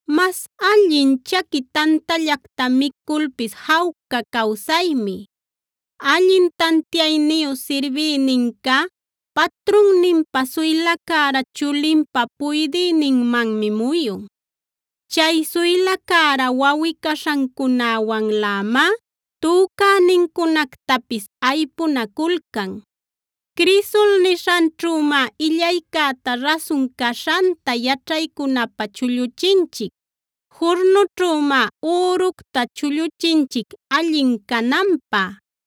mas allin chaqui tantallacta miculpis jawca cawsaymi. Allin tantiayniyu sirbïninca patrunninpa suyla cära chulinpa puydïninmanmi muyun; chay suyla cära wawꞌi-caśhancunäwanlämá, tücänincunactapis aypunaculcan. Crisol nishanćhümá illaycäta rasun caśhanta yaćhaycunapä chulluchinchic; jurnućhümá üructa chulluchinchic allin cananpä;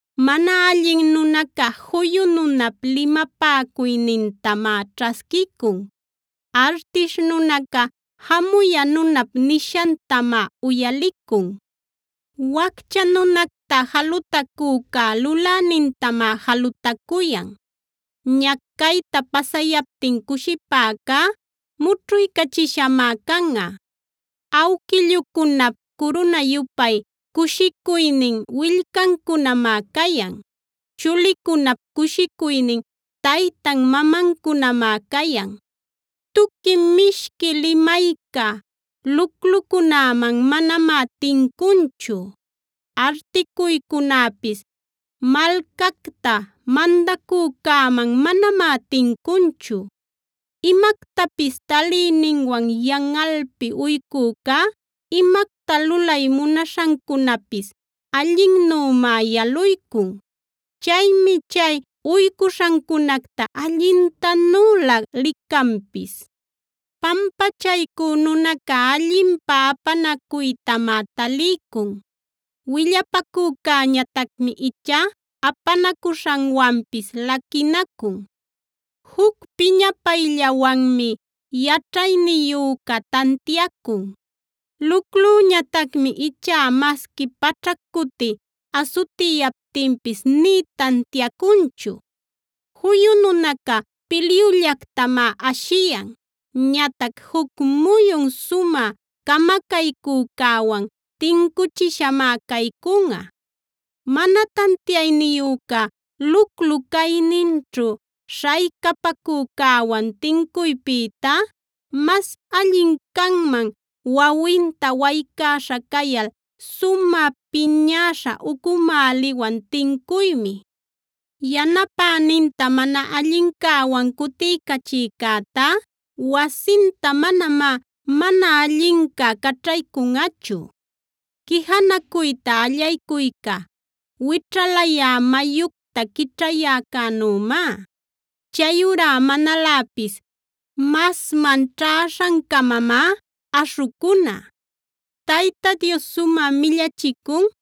Mana allin nunaca juyu nunap limapäcuynintamá ćhasquicun; artish nunaca jamuya nunap nishantamá uyalicun. Waccha nunacta jalutacücá Lulänintamá jalutacuyan; ñacayta pasayaptin cushipäcá mućhuycachishamá canꞌa. Awquillucunap curuna-yupay cushicuynin willcancunamá cayan; chulicunap cushicuynin taytan-mamancunamá cayan. Tuqui mishqui limayca luclucunäman manamá tincunchu; articuycunäpis malcacta mandacücäman manamá tincunchu. Imactapis taliyninwan yanꞌalpi uycücá, imacta lulay munaśhancunapis allinnümá yaluycun. Chaymi chay uycuśhancunacta allintanüla licanpis. Pampachaycü nunaca allinpä apanacuytamá taliycun; willapacücäñatacmi ichá apanacuśhanwanpis laquinacun. Juc piñapayllawanmi yaćhayniyüca tantiacun; luclüñatacmi ichá masqui paćhac cuti asutiyaptinpis nï tantiacunchu. Juyu nunaca pilyullactamá ashiyan; ñatac juc muyun sumä camacaycücäwan tincuchishamá caycunꞌa. Mana tantiayniyüca luclu-cayninćhu śhaycapacücäwan tincuypïtá, mas allin canman wawinta waycäśha cayal sumä piñäśha ucumäliwan tincuymi. Yanapäninta mana allincäwan cutiycachïcätá wasinta manamá mana allinca caćhaycunꞌachu. Quijanacuyta allaycuyca, wićhalayä mayucta quićhayäcänümá; chayurá manaläpis masman ćhäśhancamamá aśhucuna. Tayta Dios sumä millachicun: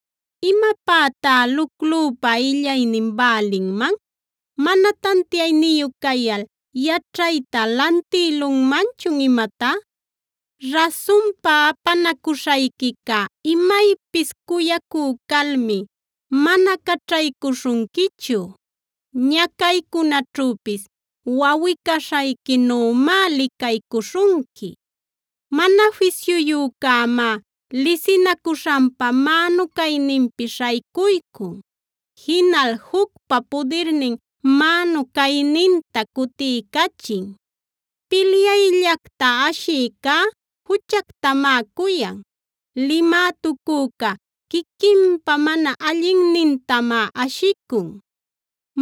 ¿Imapätá luclüpa illaynin bälinman? ¿Mana tantiayniyu cayal yaćhayta lantïlunmanchun imatá? Rasunpa apanacuśhayquicá imaypis cuyacü calmi mana caćhaycuśhunquichu; ñacaycunaćhüpis wawꞌi-caśhayquinümá licaycuśhunqui. Mana fisyuyücämá lisinacuśhanpa mänu cayninpi śhaycuycun; jinal jucpa pudirnin mänu cayninta cutiycachin. Pilyayllacta ashïcá juchactamá cuyan; limätucücá quiquinpa mana allinnintamá ashicun.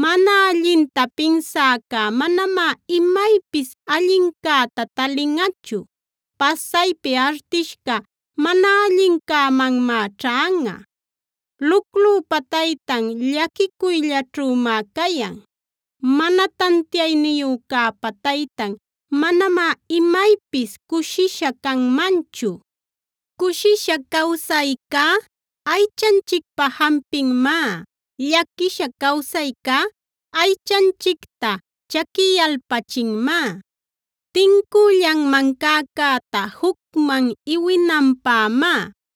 Mana allinta pinsäca manamá imaypis allincäta talinꞌachu; pasaypi artishca mana allincämanmá ćhanꞌa. Luclüpa taytan llaquicuyllaćhümá cayan; mana tantiayniyücäpa taytan manamá imaypis cushisha canmanchu. Cushisha cawsaycá aychanchicpa jampinmá; llaquisha cawsaycá aychanchicta chaquiyalpachinmá. Tincüllanman cäcäta jucman iwinanpämá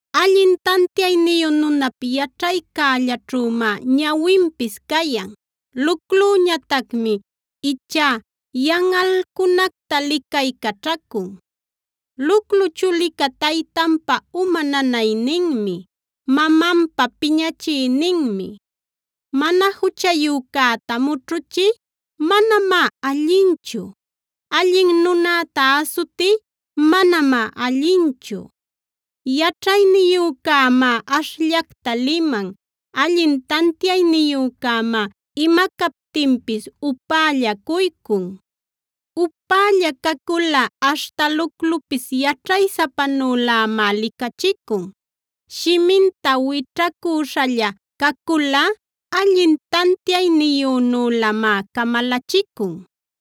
Allin tantiayniyu nunap yaćhaycällaćhümá ñawinpis cayan; luclüñatacmi ichá yanꞌalcunacta licaycaćhacun. Luclu chulica taytanpa uma nanayninmi; mamanpa piñachïninmi. Mana juchayücäta mućhuchiy manamá allinchu; allin nunäta asutiy manamá allinchu. Yaćhayniyücämá ashllacta liman; allin tantiayniyücämá ima captinpis upällacuycun. Upälla caculꞌa aśhta luclupis yaćhaysapanülämá licachicun; shiminta wićhacüśhalla caculꞌa, allin tantiayniyünülämá camalachicun.